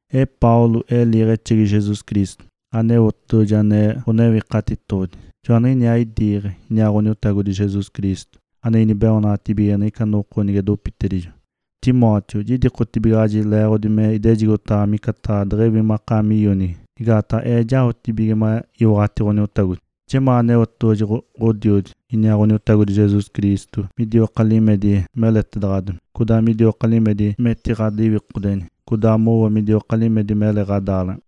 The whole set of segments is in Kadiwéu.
Ee Paulo, ee liiɡ̶exegi Jesus Cristo. Aneotedoɡ̶oji ane Ǥonewikatitoɡ̶odi, joaniɡ̶iniaa idiiɡ̶e, iniaa Ǥoniotagodi Jesus Cristo, ane inibeoonaɡ̶atibigege niɡ̶ica noko nige dopitedijo. Timóteo, jidikotibigaɡ̶aji leeɡ̶odi me idejigotaɡ̶awa micataɡ̶a deɡ̶ewi makaami ionigi, igaataɡ̶a ee jaotibige me iwaɡ̶ati Ǥoniotagodi. Jemaa Aneotedoɡ̶oji Ǥodiodi, iniaa Ǥoniotagodi Jesus Cristo midioka limedi meletaɡ̶adomi, codaa midioka limedi metiɡ̶adiwikodeni, codaa mowo midioka limedi mele ɡ̶adaaleɡ̶ena.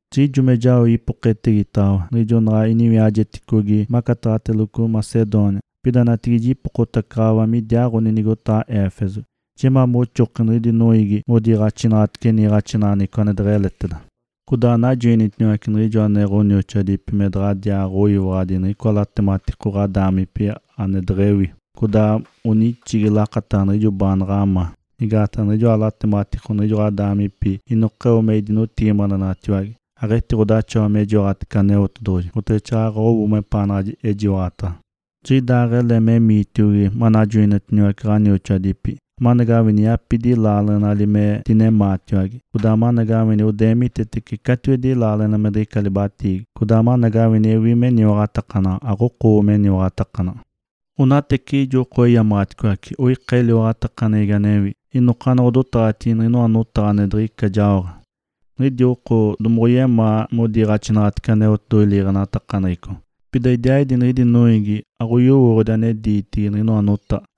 Jiɡ̶ijo me jao ipoketegitaɡ̶awa niɡ̶ijo naɡ̶a iniwiajeticogi macataɡ̶ateloco Macedônia, pida natigide jipokotacaɡ̶awa midiaaɡ̶oni nigotaɡ̶a Éfeso. Jemaa moxoki niɡ̶idi noiigi anodiiɡ̶axinaɡ̶atece niiɡ̶axinaɡ̶aneɡ̶eco ane deɡ̶eleteda. Codaa anajoinitiniwace niɡ̶ijo ane ɡ̶onioxoadipi me daɡ̶adiaaɡ̶oyiwaɡ̶adi niɡ̶icoa latematiko ɡ̶adaamipi ane deɡ̶ewi, codaa onixigi lakataɡ̶a niɡ̶ijo baanaɡ̶a ma. Igaataɡ̶a niɡ̶ijoa latematiko niɡ̶ijo ɡ̶adaamipi inokeo me idinotigimadenaɡ̶atiwage. Aɡ̶etiɡ̶odaxawa me jiwaɡ̶atece Aneotedoɡ̶oji oteɡ̶exaaɡ̶aɡ̶a owo mepaanaɡ̶a ejiwaɡ̶ataɡ̶a. Jiɡ̶idaaɡ̶ele memiitiogi manajoinitiniwace ɡ̶onioxoadipi, amanagawini yapidi laaleɡ̶enali me dinemaatiwage, codaa amanagawini odeemitetece catiwedi laaleɡ̶ena me diɡ̶ica libatiigi, codaa amanagawini ewi meniwaɡ̶atakanaɡ̶a, aɡ̶okowo meniwaɡ̶atakanaɡ̶a. Onateciɡ̶ijo oko eyamaɡ̶aticoace, oika eliwaɡ̶atakaneɡ̶egi anewi, inokaanaɡ̶a odotaɡ̶atigi niɡ̶inoa notaɡ̶a ane diɡ̶ica jaoɡ̶ate. Niɡ̶idi oko domoɡ̶oyemaa modiiɡ̶axinaɡ̶atece Aneotedoɡ̶oji liiɡ̶enatakaneɡ̶eco, pida idiaaɡ̶idi niɡ̶idi noiigi aɡ̶oyowooɡ̶odi ane diitigi niɡ̶inoa lotaɡ̶a.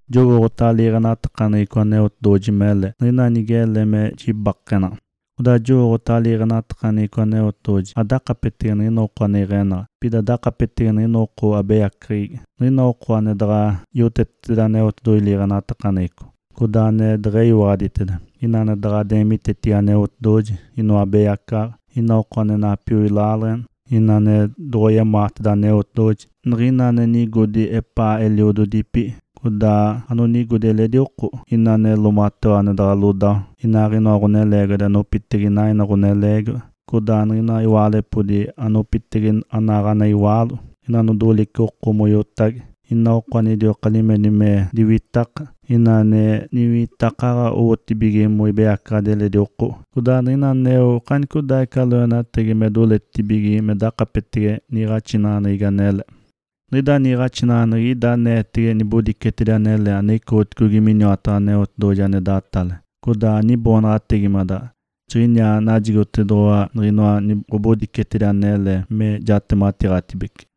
Jowooɡ̶otaɡ̶a liiɡ̶enatakaneɡ̶eco Aneotedoɡ̶oji mele, niɡ̶ina nigele me jibakenaɡ̶a. Codaa jowooɡ̶otaɡ̶a liiɡ̶enatakaneɡ̶eco Aneotedoɡ̶oji aɡ̶odakapetege niɡ̶ina oko ane iɡ̶enaɡ̶a, pida dakapetege niɡ̶ina oko abeyaceɡ̶egi; niɡ̶ina oko ane daɡ̶a yoteteteda Aneotedoɡ̶oji liiɡ̶enatakaneɡ̶eco, codaa ane deɡ̶eyiwaɡ̶aditeda, ina ane daɡ̶a deemitetibige Aneotedoɡ̶oji, inoa abeyacaɡ̶aɡ̶a, ina oko ane napioi laaleɡ̶ena, ina ane doɡ̶oyemaateda Aneotedoɡ̶oji; niɡ̶ina anonigodi epaa eliododipi, codaa anonigodi eledi oko; ina ane loomatewa ane daɡ̶a lodawa, inaaɡ̶inoa ɡ̶oneleegiwadi anopitege inaaɡ̶ina ɡ̶oneleegiwa, codaa niɡ̶ina iwaalepodi anopitege anaaɡ̶ana iwaalo; ina anodolice oko moiotage; ina oko anidioka limedi me diwitaka; ina ane niwitakaɡ̶a owotibige moibeyacaɡ̶adi eledi oko; codaa niɡ̶ina aneo okanicodaaɡ̶ica loenatagi me doletibige me dakapetege niiɡ̶axinaɡ̶aneɡ̶egi anele. Niɡ̶ida niiɡ̶axinaɡ̶aneɡ̶egi ida aneetege nibodicetedi anele anoicoɡ̶oticogi miniwataɡ̶a Aneotedoɡ̶oji ane datale, codaa aniboonaɡ̶ategimadaɡ̶a. Jiɡ̶iniaa najigotediwa niɡ̶inoa ɡ̶obodicetedi anele me jatematitedibece.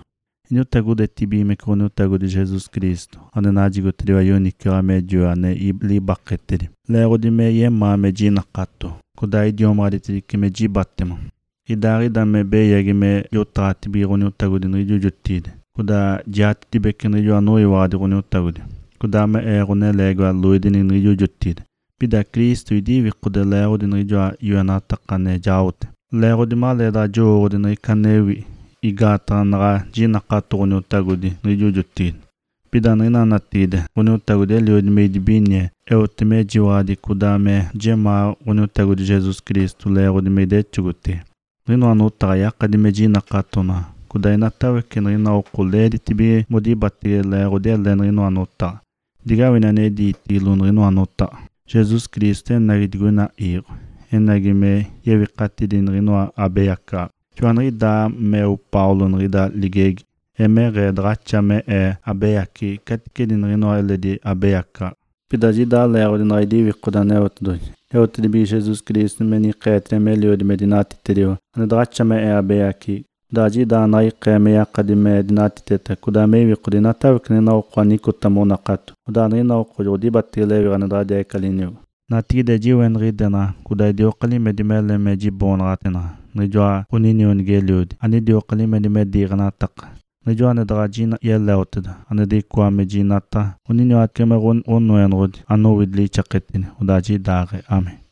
Iniotagodetibigimece Ǥoniotagodi Jesus Cristo, ane najigotediwa yoniciwaɡ̶a me joe ane libaketedi, leeɡ̶odi me yemaa me idinakato, codaa idiomaɡ̶aditedice me jibatema. Idaaɡ̶ida me beyagi me jotaɡ̶atibige Ǥoniotagodi niɡ̶ijo jotigide, codaa jiatetibece niɡ̶ijo anoyiwaɡ̶adi Ǥoniotagodi, codaa me ee ɡ̶oneleegiwa loidenigi niɡ̶ijo jotigide. Pida Cristo idiwikode leeɡ̶odi niɡ̶ijoa yoenataka ane jaote, leeɡ̶odi maleedaɡ̶a jowooɡ̶odi niɡ̶ica anewi, igaataɡ̶a anaɡ̶a jinakato Ǥoniotagodi niɡ̶ijo jotigide. Pida niɡ̶ina natigide Ǥoniotagodi eliodi me idibinie, eote mejiwaɡ̶adi codaa me jemaa Ǥoniotagodi Jesus Cristo leeɡ̶odi me idexogotege. Niɡ̶inoa notaɡ̶a yakadi me jinakatonaɡ̶a, codaa inatawece niɡ̶ina oko leeditibige modibatege leeɡ̶odi ele niɡ̶inoa notaɡ̶a. Digawini ane diitigilo niɡ̶inoa notaɡ̶a, “Jesus Cristo enagi digoina iiɡ̶o, enagi me yewikatidi niɡ̶inoa abeyacaɡ̶aɡ̶a.” (Joaniɡ̶idaa meo Paulo niɡ̶ida ligegi). Emeɡ̶ee daɡ̶axa me ee abeyaceɡ̶egi caticedi niɡ̶inoa eletidi abeyacaɡ̶aɡ̶a. Pida jiɡ̶idaa leeɡ̶odi naɡ̶a idiwikode Aneotedoɡ̶oji, eotedibige Jesus Cristo me nikeetediwa meliodi me dinatitediwa, ane daɡ̶axa me ee abeyaceɡ̶egi. Odaa jiɡ̶idaaɡ̶ee naɡ̶a ikee me yakadi me dinatiteta codaa me iwikode inatawece niɡ̶ina oko anicota monakato, odaa niɡ̶ina oko joɡ̶odibatege lewiɡ̶a ane diɡ̶ica liniogo. Natigide jiweniɡ̶idenaɡ̶a codaa idioka limedi mele me jiboonaɡ̶ateenaɡ̶a niɡ̶ijoa ɡ̶oninionigi-eliodi anidioka limedi me diiɡ̶enataka, Niɡ̶ijoa ane daɡ̶a yeleoteda, ane diɡ̶icoateda me jinataɡ̶a, oniniwatece me Ǥonoenoɡ̶odi, anowidi lixaketedi. Odaa jiɡ̶idaaɡ̶ee (Amém).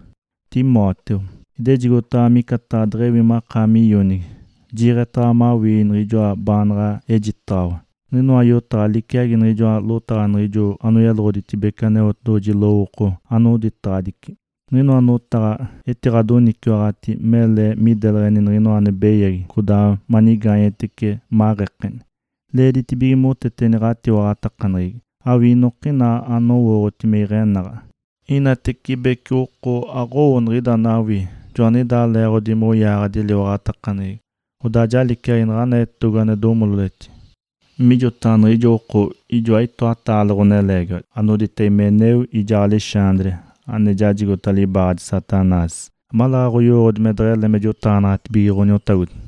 Timóteo, idejigotaɡ̶awa micataɡ̶a deɡ̶ewi makaami ionigi. Jiiɡ̶etaɡ̶awa mawii niɡ̶ijoa baanaɡ̶a ejitedaɡ̶awa. Niɡ̶inoa yotaɡ̶a liciagi niɡ̶ijoa lotaɡ̶a niɡ̶ijo anoyeloɡ̶oditedibece Aneotedoɡ̶oji lowooko anoditaɡ̶adici. Niɡ̶inoa notaɡ̶a etiɡ̶adoniciwaɡ̶ati mele mideleɡ̶eni niɡ̶inoa ane beyagi codaa manigaanyetece, maɡ̶ekeni. Leeditibige moteteni ɡ̶atiwaɡ̶atakaneɡ̶egi, awii inokina anowooɡ̶oti me iɡ̶enaɡ̶a. Inatibece oko aɡ̶owo niɡ̶ida anawii, joaniɡ̶idaa leeɡ̶odi moyaaɡ̶adi eliwaɡ̶atakaneɡ̶egi, odaa ja liciagi naɡ̶ana etogo ane domololetini. Mijotaɡ̶a niɡ̶ijo oko, ijoa itoataale ɡ̶oneleegiwadi anodita Himeneu, ijaa Alexandre, ane jajigota libaaɡ̶adi Satanás, amaleeɡ̶aɡ̶a oyowooɡ̶odi me deɡ̶ele me jotaɡ̶anaɡ̶atibige Ǥoniotagodi.